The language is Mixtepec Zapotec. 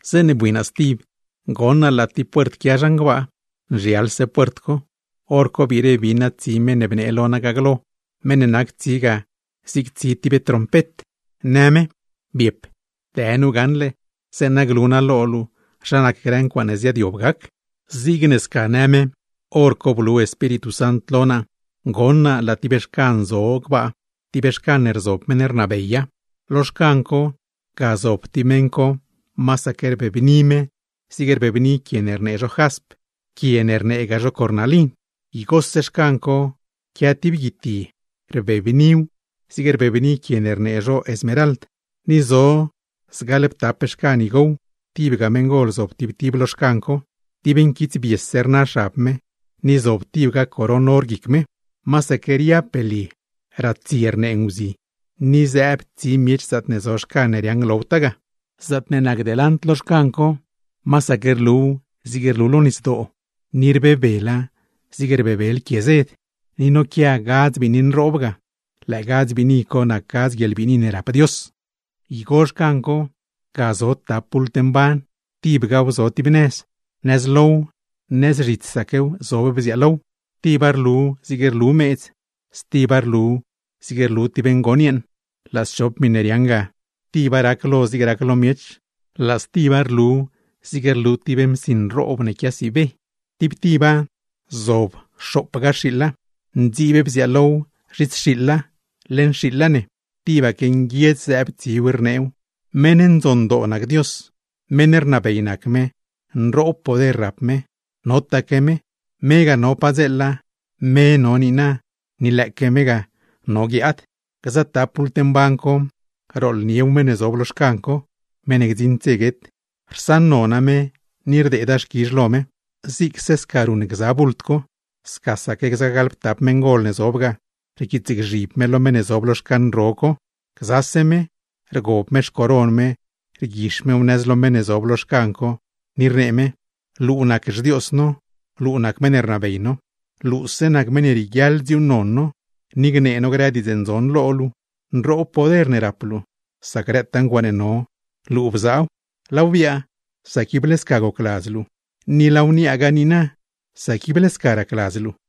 Zeeṉe bui naa stib, goṉ naa laa tib puert quia zhan gbaa, nzhialse puert co. Horco biire bin naa tsi meṉ ne bnee lo naa ga glo, meṉ ne nac tsi ga zig tsi tib trompet, në me: ―Biep, dë nu gaṉle, zeeṉa glu naa lo luu zha nac grë ncuaaṉe ziaadyob gac. Zigne sca në me, hor co blu Espíritu Sant lo naa, goṉ naa laa tib xcan zo gbaa, tib xcan ne rzob meṉ ne rnabeya. Lo xcan co, ga zob tib meṉ co, masaque rbebni me zigne rbebni quie ne rnee zho jasp, quie ne rneegaa zho cornalin. Igose xcan co quia tib guitye, rbebniw zigne rbebni quie ne rnee zho smerald; ni zo zgaḻptap xcan igow, tibga meṉgol zob tib tib lo xcan co, dib nquitsbiese rna xab me, ni zob tibga coron or guic me. Masaque riab belye, ratsie rnee nguzi, ni zëëb tsi miech zaatne zo xcan ne riaaṉ glowtaa ga. Zaatne nac delant lo xcan co, masaque rluw zig rlu lo nisdoo ni rbebela zig rbebel quie zed; ni noquia gadz biini nroob ga, lëë gadz biini co nac gadz guieḻbiini ne rap Dios. Igo xcan co, ga zo tap bult mban, tibgaw zo tib nëz; nëz low, nëz zhitsaquew zob bziaalow. Tiba rlu zig rlu meedz, stiba rlu zig rlu tib ngon yeeṉ; laa schop miṉe riaaṉ ga, tiba rac lo zig rac lo miech, laa stiba rlu zig rlu tib msi nroob ne quiasiibe. Tib tiba zob xoopga xiiḻa, ndziib bziaalow zhits xiiḻa, leṉ xiiḻa ne; tibaque nguiedz zëëb tsiw, rneew: ¡Meṉ ndzondoo nac Dios! ¡Meṉ rnabey nac me, nroob poder ne rap me! Notaque me, me ga no padzeela, me no niina, ni lëëque me ga no guiaad. Gza tap bult mban co, rooḻniew meṉ ne zob lo xcan co, (meṉ ne gdziṉd dze guet) rsaṉnona me, ni rdeeda xquizh lo me. Zigse sca ruṉ gza bult co, scasaque gza gaḻptap meṉgol ne zob ga, rquiitsgzhib me lo meṉ ne zob lo xcan ro co, gzase me, rgob me xcoron me rguix mew nëz lo meṉ ne zob lo xcan co, ni rnee me: Luu nac xDios no, luu nac meṉ ne rnabey no. Luuse nac meṉ ne rieguiaḻ dziuuṉnon no, ni gnee no grë diidz ndzon lo luu. Nroob poder ne rap luu, sac grëtaa ncuaaṉe no, luu bzaaw; laaw biaa sac ible sca gocladz luu, ni laaw niaagaa niina, sac ible sca racladz luu.